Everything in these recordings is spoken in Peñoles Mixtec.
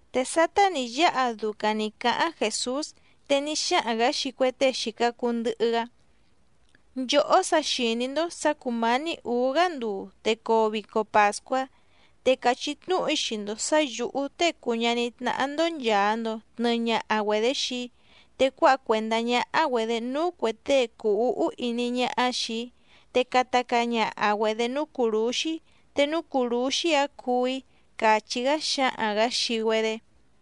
Te sátá nǐ yáha ducaⁿ nǐ cáháⁿ Jèsús, te ní xáhaⁿ‑gǎ xii cue tée xìca cuu ndɨhɨ‑gá: —Nchòhó sa xìní‑ndó sǎ cùmání ǔú‑gá nduu te coo vico pàscuá, te càchí tnúhu‑í xii‑ndo sǎ yǔhú Tée cùu ñaní tnáhá‑ndó nchàa‑ndo tnɨɨ ñaha‑güedé xii‑í, te cuáha cuèndá ñáhá‑güedě núú cuè tée cùu úhú iní ñáhá xìi‑í, te cata caa ñaha‑güedě núú cùrúxí te núú cùrúxí‑áⁿ cuú‑í —càchí‑gá xǎhaⁿ‑gǎ xii‑güedé.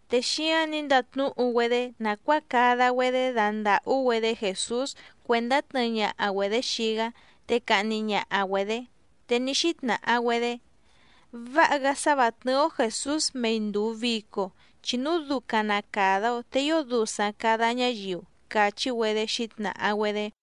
Te xíáⁿ nǐ ndatnúhu‑güedé nàcuáa cada‑güedé dandàhú‑güedé Jèsús cuèndá tnɨɨ ñaha‑güedě xii‑gá, te cahni ñaha‑güedě. Te ní xítnàha‑güedé: —Váha‑gá sá vǎ tnɨ́ɨ́‑ó Jèsús mei ndùu vico, chi núu ducaⁿ na càda‑o te ío dusaⁿ càda ñáyiu —càchí‑güedé xǐtnàha‑güedé.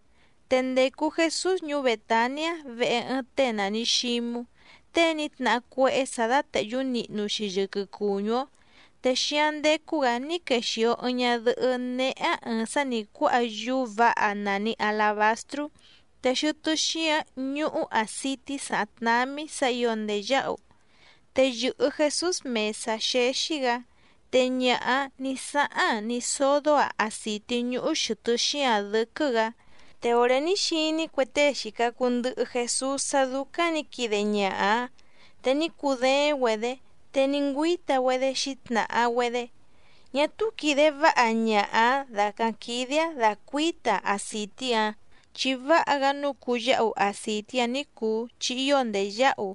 Te ndècu Jesús ñuú Bètaniá vehe ɨɨⁿ tée nàni Xímú, tée ní tnahá cuéhé sǎ dátèhyú nihnu‑xi yɨquɨ cùñú‑ó. Te xíáⁿ ndécú‑gǎ ní quexìo ɨɨⁿ ñadɨhɨ́ néhé‑áⁿ ɨ̀ɨⁿ sá nǐ cuáha yúú vǎha nàni alabastrú, te xɨtɨ́ xíǎⁿ ñúhú àcití sàháⁿ tnámí sǎ ǐo ndèyáhu. Te yɨ̀hɨ Jesús mèsá xéxí‑gǎ, te ñaha‑áⁿ nǐ sáháⁿ‑aⁿ ní sódó‑aⁿ àcití ñúhú xɨ̀tɨ́ xíǎⁿ dɨ́quɨ́‑gǎ. Te òré ní xiní cue tée xìca cuu ndɨhɨ Jesús sá dúcáⁿ nǐ quide ñaha‑áⁿ te ní cudééⁿ‑güedě, te ní ngüíta‑güedé xǐtnàha‑güedé: —Ñá túú quìde váha ñaha‑ǎⁿ dàcáⁿ quídé‑áⁿ dacuǐta‑aⁿ acìtí‑ǎⁿ. Chi váha‑gá nǔu cuyáhu acìtí‑ǎⁿ ní cùu chi ío ndèyáhu,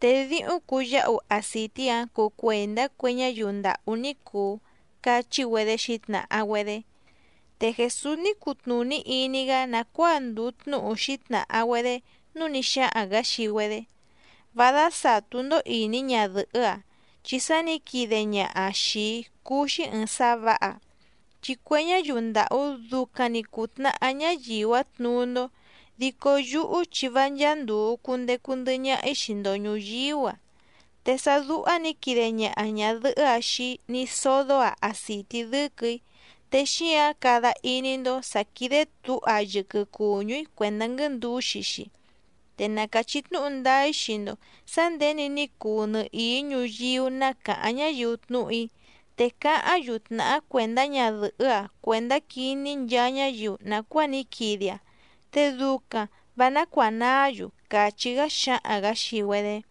te díhúⁿ cuyáhu acìtí‑ǎⁿ cuu cuèndá cue ñáyiu ndàhú ní cùu —cachí‑güedé xǐtnàha‑güedé. Te Jèsús ní cutnùní iní‑gá nàcuáa ndùu tnúhu xǐtnàha‑güedé, núu ní xáhaⁿ‑gǎ xii‑güedé: —Vá dásàtú‑ndó ìní ñadɨ̀hɨ́‑a, chi sá nǐ quide ñaha‑aⁿ xìi‑í cúú‑xí ɨ̀ɨⁿ sá vǎha. Chi cue ñáyiu ndàhú ducaⁿ‑ni cùtnahá ñáyiu‑áⁿ tnuú‑ndó, dico yúhú chi vá ncháá ndùu cundecu ndɨhɨ ñaha‑í xii‑ndo ñùyíú‑a. Te sá dúhá nǐ quide ñaha ñàdɨhɨ́‑a xii‑í ní sódó‑aⁿ àcití dɨ́quɨ̀‑í, te xíǎⁿ cada iní‑ndó sǎ sà quide túha‑aⁿ yɨquɨ cùñú‑í cuèndá nguɨ́ndǔxi‑xi. Te na càchí tnúhu ndáá‑í xii‑ndo sǎ nděni ní cuu nɨhìí ñuyíú ná càháⁿ ñáyiu tnúhu‑í, te cáháⁿ‑yu tnàhá cuèndá ñadɨ̀hɨ́‑a cuèndá quiní nchaa ñáyiu nàcuáa ní quide‑aⁿ te ducaⁿ vǎ nácuànaá‑yu —càchí‑gá xǎhaⁿ‑gǎ xii‑güedé.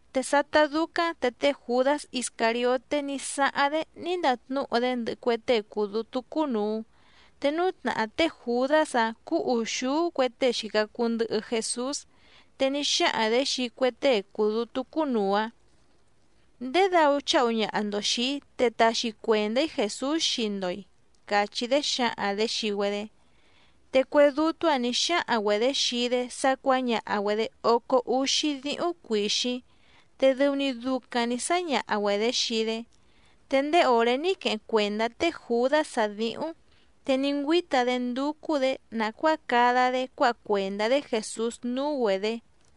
Te sátá dúcáⁿ te té Jùdás Iscàrioté ní sáháⁿ‑dé ní ndatnúhu‑dé ndɨhɨ cue tée cùu dútú cúnùu. Te núú tnàhá té Jùdás‑áⁿ cúú ùxúú cue tée xìca cuu ndɨhɨ Jesús. Te ní xáhaⁿ‑dě xii cue tée cùu dútú cúnùu‑áⁿ: —¿Ndědau cháhu ñaha‑ndo xìi‑í te taxi cuèndá‑í Jèsús xii‑ndo‑i? —càchí‑dé xǎhaⁿ‑dě xii‑güedé. Te cue dútú‑ǎⁿ nǐ xáhaⁿ‑güedě xii‑dé sá cuǎñaha‑güedě ócó úxí díhúⁿ cuìxíⁿ, te dɨu‑ni ducaⁿ nǐ sáñaha‑güedě xii‑dé. Te ndéé òré ní queheⁿ cuèndá té Jùdás‑áⁿ dǐhúⁿ, te ní ngüíta‑dé ndúcú‑dě nàcuáa cada‑dé cuáha cuèndá‑dé Jèsús núú‑güedě.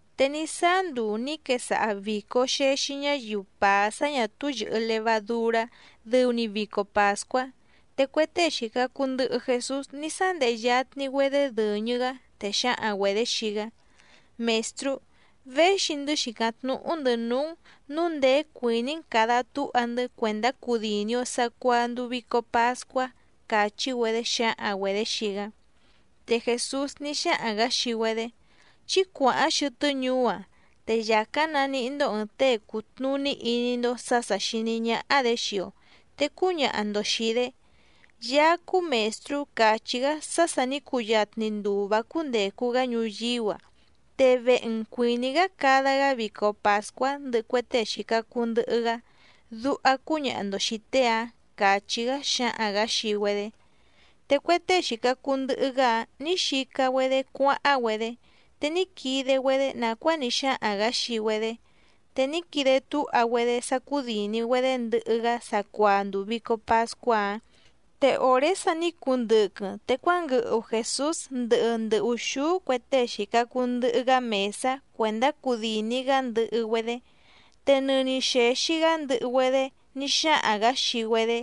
Te ní sáá nduu nǐ quesaha vìco xexi ñáyiu pàá sá ñà túú yɨ̀hɨ levadurá dɨu‑ni vico pàscuá, te cue tée xìca cuu ndɨhɨ Jesús ní sándehe yatni‑güedé dɨ̀ñɨ‑gá, te xǎhaⁿ‑güedě xii‑gá: —Mèstrú, véxi‑ndɨ́ xìcáⁿ tnúhú‑ndɨ̌ núú‑n nǔu ndèé cuìní‑n càda túha‑ndɨ́ cuèndá cudìni‑o sacuaa nduu vico pascuá —càchí‑güedé xǎhaⁿ‑güedě xii‑gá. Te Jèsús ní xáhaⁿ‑gǎ xii‑güedé: —Chí cuàháⁿ xɨtɨ́ ñuú‑ǎⁿ, te yàcáⁿ naníhí‑ndó ɨ̀ɨⁿ tée cùtnuní iní‑ndó sǎ sà xiní ñáhá‑dě xii‑o, te cúñaha‑ndo xìi‑dé: “Yaá cúú Mèstrú càchí‑gá sá sà ní cuyatni nduu vǎ cúndècu‑gá ñuyíú‑a, te vehe‑n cuìní‑gá cada‑gá vico pàscuá ndɨhɨ cue tée xìca cuu ndɨhɨ‑gá”, duha cúñaha‑ndo xìi tée‑áⁿ —càchí‑gá xǎhaⁿ‑gǎ xii‑güedé. Te cue tée xìca cuu ndɨhɨ‑gá‑áⁿ nǐ xica‑güedé cuáháⁿ‑güedé, te ní quide‑güedé nàcuáa ní xáhaⁿ‑gǎ xii‑güedé, te ní quide túha‑güedé sá cúdìni‑güedé ndɨhɨ‑gá sacuaa nduu vìco pascuá‑áⁿ. Te òré sa ní cundɨquɨⁿ te cuánguɨhu Jèsús ndɨhɨ ndɨ ùxúú cue tée xìca cuu ndɨhɨ‑gá mèsá cuèndá cudìni‑gá ndɨhɨ‑güedé. Te nɨni xèxi‑gá ndɨhɨ‑güedé ní xáhaⁿ‑gǎ xii‑güedé: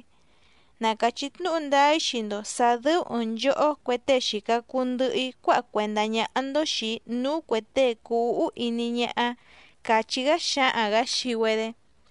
—Na càchí tnúhu ndáá‑í xii‑ndo sǎ dɨ́ú ɨ̀ɨⁿ nchohó cue tée xìca cuu ndɨhɨ‑í cuáha cuèndá ñáhá‑ndó xìi‑í núú cuè tée cùu úhú iní ñáhá —càchí‑gá xǎhaⁿ‑gǎ xii‑güedé.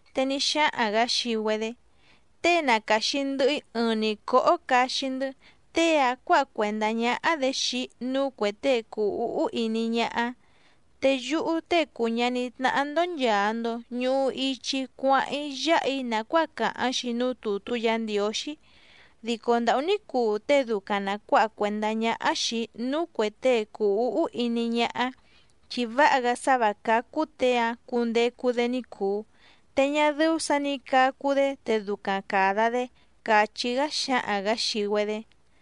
Te ní xáhaⁿ‑gǎ xii‑güedé: —Tée nacaxi ndɨhɨ‑í ɨɨⁿ‑ni cóhó caxi‑ndɨ́, tée‑áⁿ cuǎha cuèndá ñáhá‑dě xii‑í núú cuè tée cùu úhú iní ñáhá. Te yúhú Tée cùu ñaní tnáhá‑ndó nchàa‑ndo ñuhu ichi‑í cuáháⁿ‑í yáha‑í nàcuáa càháⁿ‑xi núú tùtú Yǎ Ndiǒxí, dico ndàhú ní cuu tée ducaⁿ na cuǎha cuèndá ñáhá xìi‑í núú cuè tée cùu úhú iní ñáhá, chi váha‑gá sá vǎ cácú těe‑áⁿ cundecu‑dé ní cùu, te ñá dɨ́ú sǎ nǐ cacu‑dé te ducaⁿ càda‑dé —càchí‑gá xǎhaⁿ‑gǎ xii‑güedé.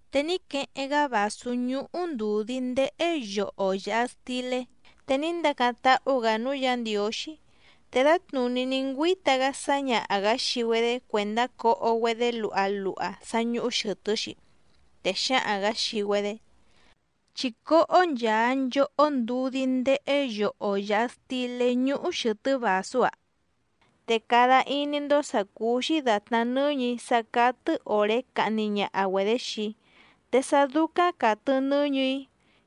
Te ní queheⁿ‑gá vàsú ñúhú ndùdí ndéhé yoho yàha stilé, te ní ndacáⁿ táhú‑gǎ núú Yǎ Ndiǒxí, te dǎtnùní ní ngüíta‑gá sǎñaha‑gǎ xii‑güedé cuèndá coho‑güedé luha luha sá ñúhú xɨ̀tɨ́‑xi, te xǎhaⁿ‑gǎ xii‑güedé: —Chí cóhó nchàa nchohó ndudí ndéhé yoho yàha stilé ñúhú xɨ̀tɨ́ vàsú‑a. Te cada iní‑ndó sǎ cúú‑xí dàtná nɨ́ñɨ̀‑í sá cátɨ́ òré cahni ñaha‑güedě xii‑í, te sá dúcáⁿ càtɨ nɨ́ñɨ̀‑í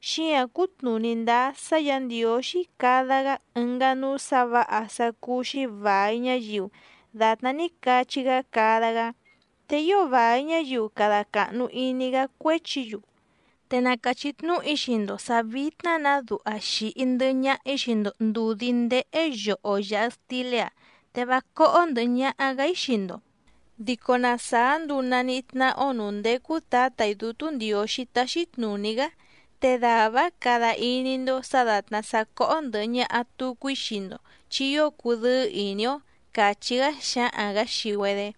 xíǎⁿ cutnùní ndáá sá Yǎ Ndiǒxí cada‑gá ɨngá núú sǎ vǎha sá cúú‑xí vài ñáyiu dàtná ní cachí‑gá cada‑gá, te ío vài ñáyiu cada càhnu iní‑gá cuéchi‑yu. Te na càchí tnúhu‑í xii‑ndo sǎ vítná‑nǎ duha xìhi ndɨhɨ ñaha‑í xii‑ndo ndùdí ndéhé yoho yàha stilé‑a, te vá cóhó ndɨ̀hɨ ñaha‑gá‑í xii‑ndo, dico na sàá nduu nànihí tnáhá‑ó nǔú ndécú Tǎtà‑í Dútú Ndiǒxí táxí tnùní‑gá te dàvá‑áⁿ cada iní‑ndó sǎ dàtná sá cóhó ndɨ̀hɨ ñaha tucu‑í xii‑ndo chi ío cudɨ́ɨ́ ìní‑ó —càchí‑gá xǎhaⁿ‑gǎ xii‑güedé.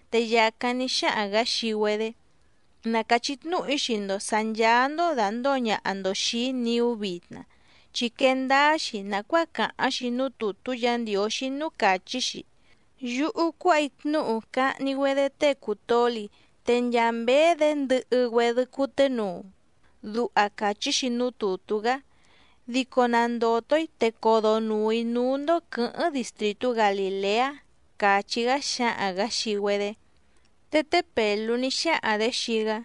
Te yàcáⁿ ní xáhaⁿ‑gǎ xii‑güedé: —Na càchí tnúhu‑í xii‑ndo sǎ ncháá‑ndó dàndóo ñaha‑ndo xìi‑í niú vitna, chi quee ndáá‑xi nàcuáa càháⁿ‑xi núú tùtú Yǎ Ndiǒxí núú càchí‑xi: “Yúhú cuáha‑í tnúhu cahni‑güedé tée cùu toli, te nchaa mběé‑dě ndɨhɨ‑güedɨ cuténuu”, duha càchí‑xi núú tùtú‑gá. Dico na ndòto‑í te codonùu‑í núú‑ndó quɨ̌hɨ́ⁿ distrìtú Galìleá —càchí‑gá xǎhaⁿ‑gǎ xii‑güedé. Te té Pèlú ní xáhaⁿ‑dě xii‑gá: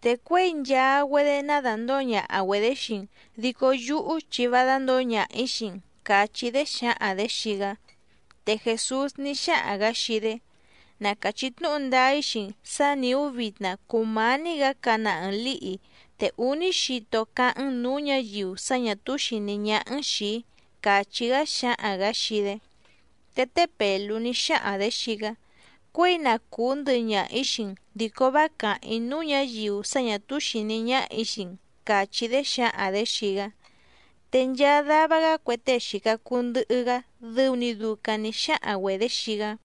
—Te cuěi nchaa‑güedé ná dàndóo ñaha‑güedě xii‑n, dico yúhú chi vá dándǒo ñaha‑ǐ xii‑n —càchí‑dé xǎhaⁿ‑dě xii‑gá. Te Jèsús ní xáhaⁿ‑gǎ xii‑dé: —Na càchí tnúhu ndáá‑í xii‑n sǎ nìú vitna cùmání‑gǎ cana ɨɨⁿ lǐhi, te úní xito cáháⁿ‑n nǔú ñǎyiu sá ñà túú xìní ñáhá‑n xìi‑í —càchí‑gá xǎhaⁿ‑gǎ xii‑dé. Te té Pèlú ní xáhaⁿ‑dě xii‑gá: —Cuěi na cùú ndɨhɨ ñaha‑ǐ xii‑n dico vá càháⁿ‑í núú ñǎyiu sá ñà túú xìní ñáhà‑í xii‑n —càchí‑dé xǎhaⁿ‑dě xii‑gá. Te nchaa dava‑gá cue tée xìca cuu ndɨhɨ‑gá dɨu‑ni ducaⁿ nǐ xáhaⁿ‑güedě xii‑gá.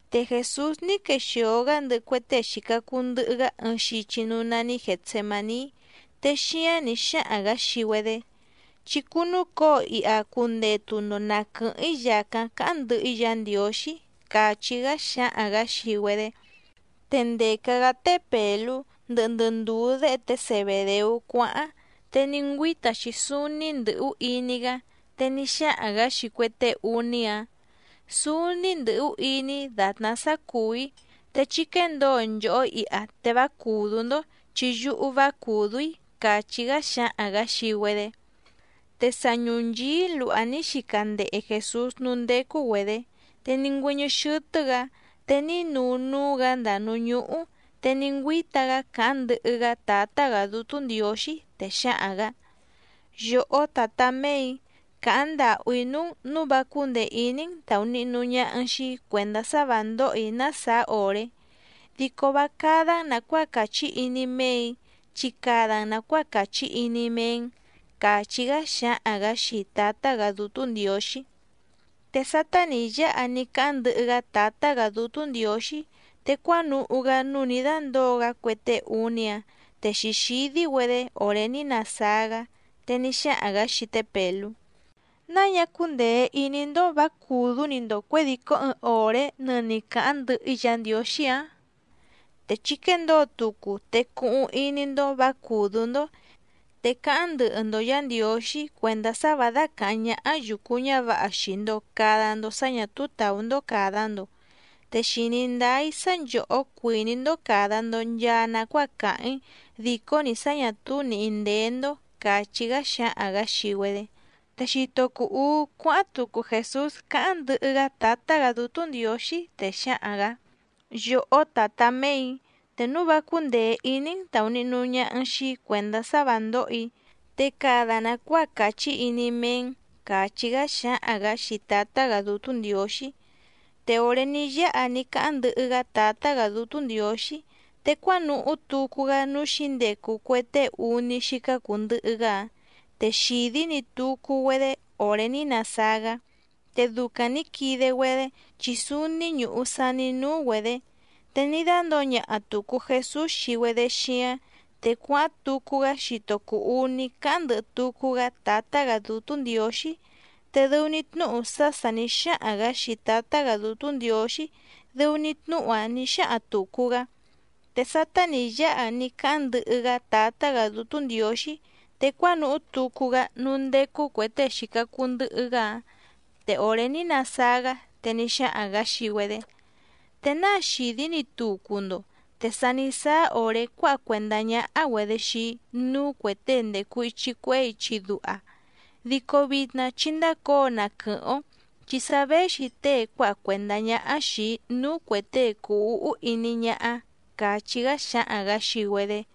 Te Jèsús ní quexìo‑gá ndɨhɨ cue tée xìca cuu ndɨhɨ‑gá ɨɨⁿ xichi núú nání Gètsemaní, te xíáⁿ nǐ xáhaⁿ‑gǎ xii‑güedé: —Chí cúnúcǒo iha cundetu‑ndo na quɨ̀hɨ́ⁿ‑í yàcáⁿ cáháⁿ ndɨhɨ‑í Yǎ Ndiǒxí —càchí‑gá xǎhaⁿ‑gǎ xii‑güedé. Te ndèca‑gá té Pèlú, ndɨhɨ ndɨ ndùú déhe té Zebèdeú cuáháⁿ, te ní ngüíta‑xi súúní ndɨ̀hú iní‑gá. Te ní xáhaⁿ‑gǎ xii cue tée úní‑áⁿ: —Súúní ndɨ̀hú iní‑í dàtná sá cùú‑í, te chí quéndǒo nchòhó iha te vá cùdú‑ndó chi yúhú vá cùdú‑í —càchí‑gá xǎhaⁿ‑gǎ xii‑güedé. Te sa ñùnchií luha ní xica ndehe Jèsús núú ndécú‑güedě, te ní ngüɨ́ñɨ́ xɨ́tɨ́‑gǎ te ní nuu núú‑gǎ ndàa núú ñúhú, te ní ngüíta‑gá càháⁿ ndɨhɨ‑gá Tǎtá‑gǎ Dútú Ndiǒxí, te xǎhaⁿ‑gǎ: —Yòhó Tǎtá méè‑í, càháⁿ ndàhú‑í núú‑n nǔu vá cúndèe iní‑n tàunihnu ñaha‑n xii‑í cuèndá sá vǎ ndóhò‑í ná sàá òré, dico vá cádá‑n nàcuáa càchí iní méè‑í, chi cada‑n nàcuáa càchí iní méé‑n —càchí‑gá xǎhaⁿ‑gǎ xii Tǎtá‑gǎ Dútú Ndiǒxí. Te sátá nǐ yáha ní cáháⁿ ndɨhɨ‑gá Tǎtá‑gǎ Dútú Ndiǒxí, te cuánuhú‑gá núú nǐ dándǒo‑gá cue tée úní‑áⁿ te xǐxídí‑güedé òré ní nasáá‑gá, te ní xáhaⁿ‑gǎ xii té Pèlú: —¿Náa ñá cúndèe iní‑ndó vǎ cùdú‑ni‑ndo cuědìcó ɨɨⁿ òré nɨni càháⁿ ndɨhɨ‑í Yǎ Ndiǒxí‑ǎⁿ? Te chí quéndǒo tucu te cuhuⁿ iní‑ndó vǎ cùdú‑ndó, te cáháⁿ ndɨhɨ‑ndo Yǎ Ndiǒxí cuèndá sá vǎ dácàháⁿ ñáhá yùcu ñávǎha xii‑ndo càda‑ndo sá ñà túú tàú‑ndó càda‑ndo. Te xìní ndáá‑í sá nchòhó cuìní‑ndó càda‑ndo nchaa nacuáa càháⁿ‑í dìcó‑ni sá ñà túú nìhí ndéé‑ndó —càchí‑gá xǎhaⁿ‑gǎ xii‑güedé. Te xito cùu uú cuáháⁿ tucu Jèsús cáháⁿ ndɨhɨ‑gá Tǎtá‑gǎ Dútú Ndiǒxí, te xǎhaⁿ‑gǎ: —Yòhó Tǎtá méè‑í, te núu vá cúndèe iní‑n tàunihnu ñaha‑n xii‑í cuèndá sá vǎ ndóhò‑í, te cada nàcuáa càchí iní méé‑n —càchí‑gá xǎhaⁿ‑gǎ xii Tǎtá‑gǎ Dútú Ndiǒxí. Te òré ní yáha ní cáháⁿ ndɨhɨ‑gá Tǎtá‑gǎ Dútú Ndiǒxí, te cuánuhú tucu‑gá núú xǐndecu cue tée úní xícá cùu ndɨhɨ‑gá‑áⁿ, te xìdí‑ni tucu‑güedé òré ní nasáá‑gá, te ducaⁿ nǐ quide‑güedé chi súúní ñùhu saní núú‑güedě. Te ní dándǒo ñaha tùcu Jesús xii‑güedé xíáⁿ, te cuáháⁿ tucu‑gá xito cùu uní cáháⁿ ndɨhɨ tucu‑gá Tǎtá‑gǎ Dútú Ndiǒxí, te dɨu‑ni tnúhu sá sà ní xáhaⁿ‑gǎ xii Tǎtá‑gǎ Dútú Ndiǒxí, dɨu‑ni tnúhu‑áⁿ nǐ xáhaⁿ tùcu‑gá. Te sátá nǐ yáha ní cáháⁿ ndɨhɨ‑gá Tǎtá‑gǎ Dútú Ndiǒxí, te cuánuhú tucu‑gá núú ndécú cuè tée xìca cuu ndɨhɨ‑gá‑áⁿ, te òré ní nasáá‑gá, te ní xáhaⁿ‑gǎ xii‑güedé: —¿Te náa xìdí‑ni tucu‑ndo? Te sa ní sáá òré cuáha cuèndá ñáhá‑güedě xii‑í núú cuè tée ndècu ichi cuehé ichi duha. Dico vitna chí ndácǒo na quɨ̀hɨ́ⁿ‑ó, chi sa véxi tée cuáha cuèndá ñáhá xìi‑í núú cuè tée cùu úhú iní ñáhá —càchí‑gá xǎhaⁿ‑gǎ xii‑güedé.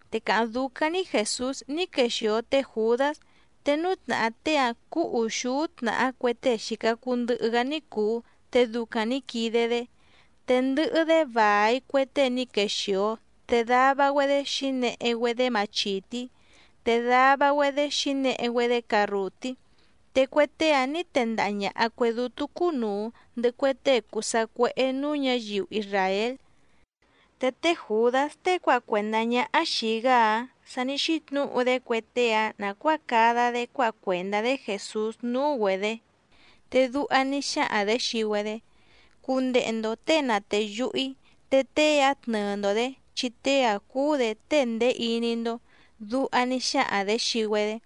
Te càháⁿ dúcáⁿ‑ní Jèsús ní quexìo té Jùdás. Te núú tnàhá tée‑áⁿ cúú ùxúú tnàhá cue tée xìca cuu ndɨhɨ‑gá ní cùu te ducaⁿ nǐ quide‑dé. Te ndɨhɨ‑dé vài cue tée ní quexìo te dava‑güedé xǐnehe‑güedé machìtí, te dava‑güedé xǐnehe‑güedé carrùtí. Te cue tée‑áⁿ nǐ tendaha ñàha cue dútú cúnùu, ndɨhɨ cue tée cùu sacuéhé nǔú ñǎyiu isràél. Te té Jùdás tée cuáha cuèndá ñáhá xìi‑gá‑áⁿ sa ní xítnǔhu‑dé cue tée‑áⁿ nàcuáa cada‑dé cuáha cuèndá‑dé Jèsús núú‑güedě, te duha ní xáhaⁿ‑dě xii‑güedé: —Cundehe‑ndo těe na tèyuhu‑í te tée‑áⁿ tnɨɨ‑ndo‑dě chi tée‑áⁿ cúú‑dě tée ndèé iní‑ndó —duha ní xáhaⁿ‑dě xii‑güedé.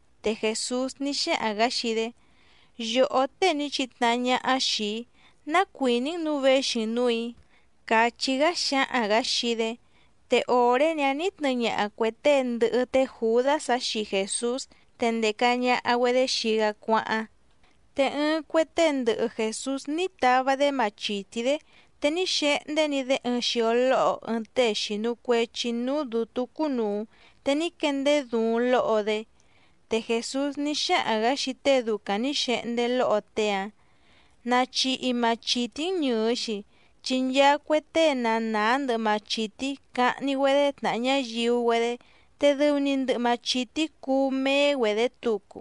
Te Jèsús ní xáhaⁿ‑gǎ xii‑dé: —Yòhó tée ní chitnahá ñáhá xìi‑í, ¿ná cuìní‑n nǔu véxi‑n nǔù‑í? —càchí‑gá xǎhaⁿ‑gǎ xii‑dé. Te òré‑ni‑áⁿ nǐ tnɨɨ ñaha cuè tée ndɨhɨ té Jùdás‑áⁿ xii Jèsús, te ndèca ñaha‑güedé xii‑gá cuáháⁿ. Te ɨɨⁿ cue tée ndɨhɨ Jèsús ní tava‑dé machìtí‑dé, te ní xehndé‑ni‑dé ɨɨⁿ xio lóho ɨɨⁿ tée xìnu cuechi núú dǔtú cúnùu te ní quendeé duuⁿ lóho‑dé. Te Jèsús ní xáhaⁿ‑gǎ xii tée ducaⁿ nǐ xehndé lóho tée‑áⁿ: —Nachihi machìtí‑n ñɨ̀ɨ‑xi, chi nchaa cue tée na nàá ndɨhɨ machìtí cahni‑güedé tnàha ñáyiu‑güedé te dɨu‑ni ndɨhɨ machìtí cuú méé‑güedě tucu.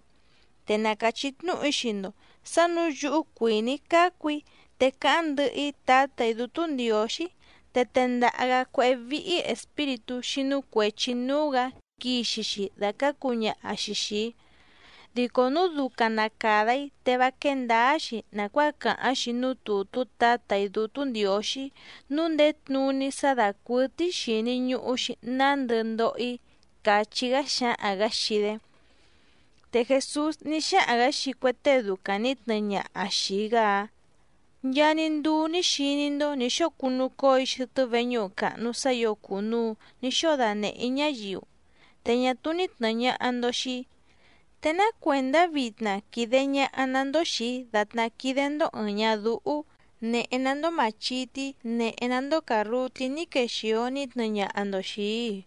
Te na càchí tnúhu‑í xii‑ndo sǎ nǔu yúhú cuìní‑í cácu‑í te cáháⁿ ndɨhɨ‑í Tǎtà‑í Dútú Ndiǒxí, te tendaha‑gǎ cuéhé víhí espíritú xínú cuèchi núú‑gǎ quixi‑xi dàcácu ñaha‑xi xìi‑í. Dico núu ducaⁿ na càda‑í te vá quéé ndǎá‑xi nàcuáa càháⁿ‑xi núú tùtú Tǎtà‑í Dútú Ndiǒxí núú ndèé tnuní sá dàcuɨtɨ́í xìni ñuhu‑xi nándɨ ndoho‑í —càchí‑gá xǎhaⁿ‑gǎ xii‑dé. Te Jèsús ní xáhaⁿ‑gǎ xii cue tée ducaⁿ nǐ tnɨɨ ñaha xìi‑gá‑áⁿ: —Nchaa‑ni nduu ní xiní‑ndó nǐ xóo cunucóo‑í xɨtɨ́ veñúhu càhnu sá ǐo cùnuu ní xóo danèhé‑í ñáyiu, te ñá túú ní tnɨ̀ɨ ñaha‑ndo xii‑í, ¿te ná cuèndá vitna quìde ñaha‑ná‑ndó xìi‑í dàtná quídé‑ndó ɨ̀ɨⁿ ñadúhú, nèhe‑ná‑ndó màchití nèhe‑ná‑ndó càrrutí ní quexìo ní tnɨɨ ñaha‑ndo xìi‑í‑i?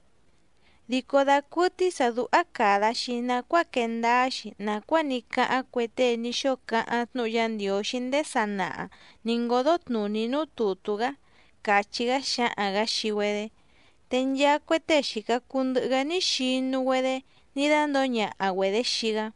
Dico dacuɨtɨ́í sǎ dúhá càda‑xi nacuáa quee ndáá‑xi nàcuáa ní cáháⁿ cue tée ní xóo cáháⁿ tnúhu Yá Ndiǒxí ndéé sanaha nǐ ngódó tnùní núú tùtú‑gá —càchí‑gá xǎhaⁿ‑gǎ xii‑güedé. Te nchaa cue tée xìca cuu ndɨhɨ‑gá ní xinu‑güedé ní dándǒo ñaha‑güedě xii‑gá.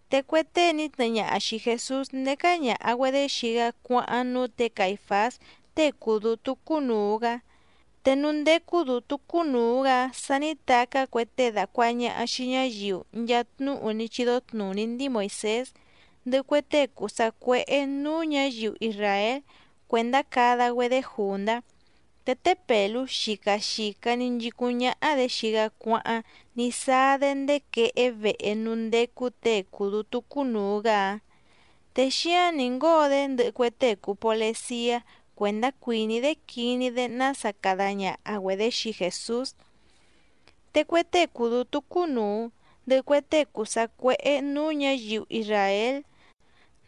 Te cue tée ní tnɨɨ ñaha xìi Jesús ndécá ñàha‑güedé xii‑gá cuáháⁿ núú tě Caìfás tée cùu dútú cúnùu‑gá. Te núú ndécú dǔtú cúnùu‑gá‑áⁿ sa ní tacá cue tée dàcuaha ñaha xii ñáyiu nchaa tnúhu ní chídó tnùní ndíi Moìsés, ndɨhɨ cue tée cùu sacuéhé nǔú ñǎyiu isràél cuèndá cada‑güedé jùndá. Te té Pèlú xica xìca‑ni nchicúⁿ ñáhá‑dě xii‑gá cuáháⁿ ní sáá‑dé ndéé quehé vehe núú ndécú těe cùu dútú cúnùu‑gá‑áⁿ, te xíáⁿ nǐ ngóo‑dé ndɨhɨ cue tée cùu poleciá cuèndá cuìní‑dé quiní‑dé nása cada ñaha‑güedě xii Jèsús. Te cue tée cùu dútú cúnùu, ndɨhɨ cue tée cùu sacuéhé nǔú ñǎyiu isràél,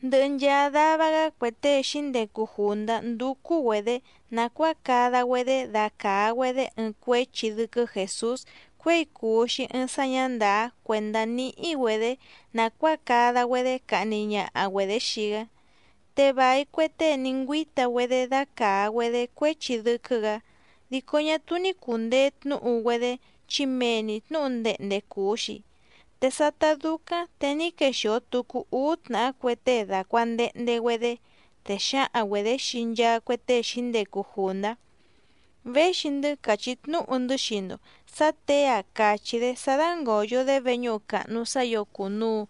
ndɨhɨ nchaa dava‑gá cue tée xǐndecu jùndá ndúcú‑güedě nàcuáa cada‑güedé dacàa‑güedé ɨɨⁿ cuéchi dɨ́quɨ́ Jèsús cuěi cùu‑xi ɨɨⁿ sá ñǎ ndàá cuèndá níhí‑güedě nàcuáa cada‑güedé cahni ñaha‑güedě xii‑gá. Te vài cue tée ní ngüíta‑güedé dácàa‑güedé cuéchi dɨ́quɨ́‑gǎ, dico ñá túú ní cùndee tnúhu‑güedé chi mee‑ni tnǔhu ndehnde cùu‑xi. Te sátá dúcáⁿ te ní quexìo tucu úú tnàhá cue tée dàcuandehnde‑güedé, te xǎhaⁿ‑güedě xii nchaa cue tée xǐndecu jùndá: —Véxi‑ndɨ́ càchí tnúhu‑ndɨ́ xii‑ndo sǎ těe‑a càchí‑dé sá dángòyo‑dé veñúhu càhnu sá ǐo cùnuu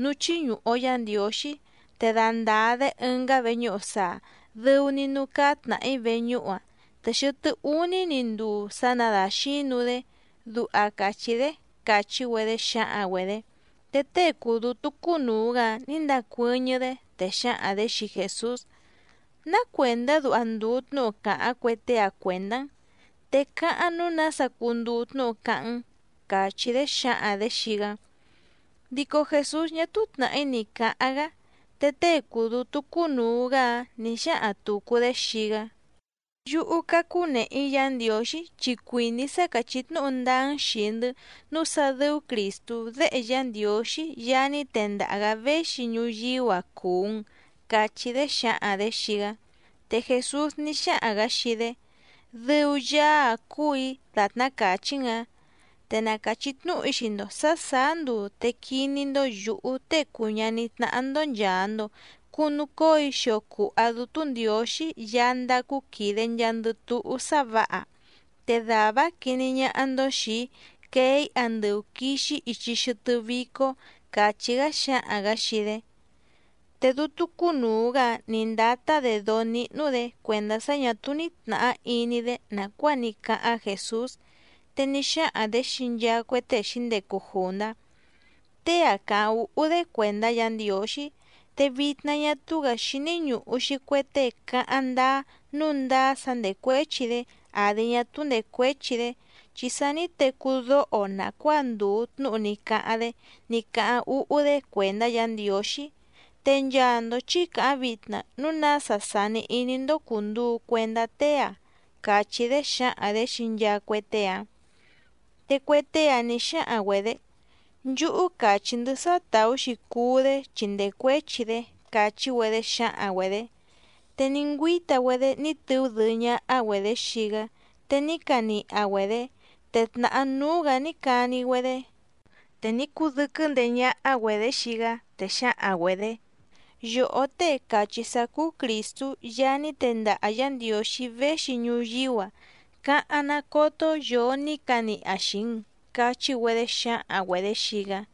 núú chíñùhu‑o Yá Ndiǒxí, te dandàa‑dé ɨngá veñúhu saa, dɨu‑ni núú cáá tnàhí veñúhu‑ǎⁿ, te xɨtɨ́ úní‑ni nduu sa nadaxǐnu‑dé, duha càchí‑dé —càchí‑güedé xǎhaⁿ‑güedě. Te tée cùu dútú cúnùu‑gá‑áⁿ nǐ ndacuɨ́ñɨ́‑dé, te xǎhaⁿ‑dě xii Jèsús: —¿Ná cuèndá duha ndùu tnúhu càháⁿ cue tée‑a cuèndá‑n? Te cáháⁿ nǔu nása cunduu tnúhu cáháⁿ‑n —càchí‑dé xǎhaⁿ‑dě xii‑gá. Dico Jèsús ñá túú tnàhí ni cǎháⁿ‑gá. Te tée cùu dútú cúnùu‑gá‑áⁿ nǐ xáhaⁿ tùcu‑dé xii‑gá: —Yúhú, cácú nèhe‑í Yǎ Ndiǒxí chi cuìní‑í sá càchí tnúhu ndáá‑n xìi‑ndɨ́ nǔu sá dɨ́ú Crìstú Déhe Yá Ndiǒxí Yaá ní tendaha‑gǎ véxi ñuyíú‑a cùu‑n —cachí‑dé xǎhaⁿ‑dě xii‑gá. Te Jèsús ní xáhaⁿ‑gǎ xii‑dé: —Dɨu Yaá‑áⁿ cúù‑í dàtná càchí‑n‑ǎⁿ, te na càchí tnúhu‑í xii‑ndo sǎ sàá nduu te quiní‑ndó yǔhú Tée cùu ñaní tnáhá‑ndó nchàa‑ndo cunucóo‑í xio cùha Dútú Ndiǒxí Yaá ndácú quìde nchaandɨ túhú sá vǎha. Te dàvá‑áⁿ quiní ñáhá‑ndó xìi‑í quee‑í andɨu quìxi‑í ichi xɨtɨ́ vícó —càchí‑gá xǎhaⁿ‑gǎ xii‑dé. Te dútú cúnùu‑gá‑áⁿ nǐ ndátá‑dě dóó níhnú‑dě cuèndá sá ñà túú ní tnàhá iní‑dé nàcuáa ní cáháⁿ Jèsús, te ní xáhaⁿ‑dě xii nchaa cue tée xǐndecu jùndá: —Tée‑a càháⁿ úhú‑dé cuèndá Yǎ Ndiǒxí, te vitna ñá túú‑gǎ xíní ñùhu‑xi cue tée cáháⁿ ndáá nǔu ndáá sá ndècuéchi‑dé àdi ñá túú ndècuéchi‑dé, chi sa ní tecú dóho‑o nàcuáa ndùu tnúhu ní cáháⁿ‑dé ní cáháⁿ úhú‑dé cuèndá Yǎ Ndiǒxí. Te nchaa‑ndo chǐ càháⁿ vitna núu nása sàni iní‑ndó cùnduu cuendá tée‑a —càchí‑dé xǎhaⁿ‑dě xii nchaa cue tée‑áⁿ. Te cue tée‑áⁿ nǐ xáhaⁿ‑güedě: —Nchúhú càchí‑ndɨ́ sá tàú‑xi cuú‑dé chi ndècuéchi‑dé —càchí‑güedé xǎhaⁿ‑güedě. Te ní ngüíta‑güedé ní tɨú dɨɨ́ ñáhá‑güedě xii‑gá te ní caniha‑güedě, te tnàhá núú‑gǎ ní cani‑güedé. Te ní cudɨ́quɨ́ ndeé ñáhá‑güedě xii‑gá, te xǎhaⁿ‑güedě: —Yòhó Tée càchí sá cúú Crìstú Yaá ní tendaha Yǎ Ndiǒxí véxi ñuyíú‑a, cáháⁿ ná còto yoo ní caniha xìi‑n —cachí‑güedé xǎhaⁿ‑güedě xii‑gá.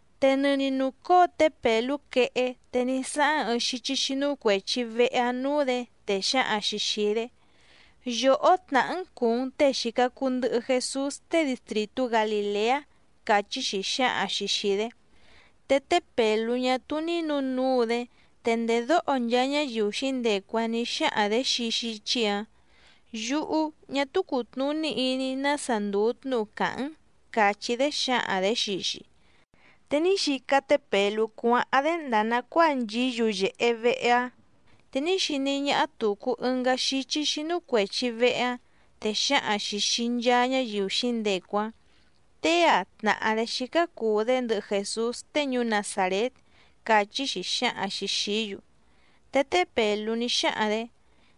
Te nɨni nùcóo té Pèlú quehé, te ní sáháⁿ ɨɨⁿ xíchí xínú cuèchi vehe‑áⁿ nǔú‑dě, te xǎhaⁿ‑xi xìi‑dé: —Yòhó tnàhá‑n cùu‑n tée xìca cuu ndɨhɨ Jesús tée distrìtú Galìleá —càchí‑xi xǎhaⁿ‑xi xìi‑dé. Te té Pèlú ñá túú ní nǔnuu‑dé, te ndèdóho nchaa ñáyiu xǐndecu‑áⁿ nǐ xáhaⁿ‑dě xii xíchí‑ǎⁿ: —Yúhú, ñá túú cùtnuní iní‑í nása ndùu tnúhu càháⁿ‑n —càchí‑dé xǎhaⁿ‑dě xii‑xi. Te ní xica té Pèlú cuáháⁿ‑dé ndàa nacuáa nchìí yuyèhe vehe‑áⁿ, te ní xiní ñáhá tùcu ɨngá xíchí xínú cuèchi vehe‑áⁿ, te xǎhaⁿ‑xi xìi nchaa ñáyiu xǐndecu‑áⁿ: —Tée‑a tnàhá‑dé xícá cùu‑dé ndɨhɨ Jèsús tée ñuú Nazàrét —càchí‑xi xǎhaⁿ‑xi xìí‑yu. Te té Pèlú ní xáhaⁿ‑dě: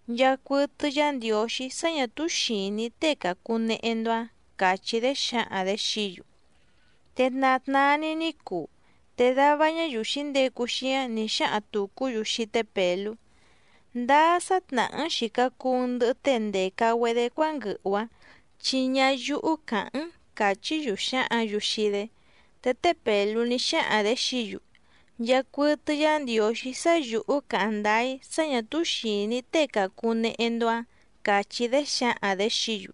—Nchàcuɨtɨ Yá Ndiǒxí sá ñà túú xìní‑í tée càcunehe‑ndo‑áⁿ —càchí‑dé xǎhaⁿ‑dě xií‑yu. Te tna tnaa‑ni ní cuu, te dava ñáyiu xǐndecu xíáⁿ nǐ xáhaⁿ tùcú‑yu xii té Pèlú: —Ndáá sá tnàhá‑n xìca cuu‑n ndɨhɨ tée ndèca‑güedé cuánguɨhu‑ǎⁿ, chi ñáyúhú càháⁿ‑n —càchí‑yu xǎhǎⁿ‑yu xii‑dé. Te té Pèlú ní xáhaⁿ‑dě xií‑yu: —Nchàcuɨtɨ Yá Ndiǒxí sá yǔhú càháⁿ ndáá‑í sá ñà túú xìní‑í tée càcunehe‑ndo‑áⁿ —càchí‑dé xǎhaⁿ‑dě xií‑yu.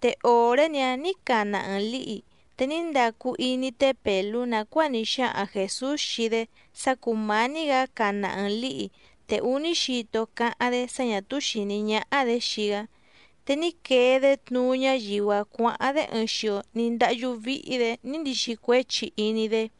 Te òré‑ni‑áⁿ nǐ cana ɨɨⁿ lǐhi. Te ní ndacu iní té Pèlú nàcuáa ní xáhaⁿ Jèsús xii‑dé sá cùmání‑gǎ cana ɨɨⁿ lǐhi te úní xito cáháⁿ‑dé sá ñà túú xìní ñáhá‑dě xii‑gá. Te ní quee‑dé tnuú ñáyiu‑áⁿ cuǎháⁿ‑dé ɨɨⁿ xio ní ndáhyú víhí‑dě ní ndixi cuéchi iní‑dé.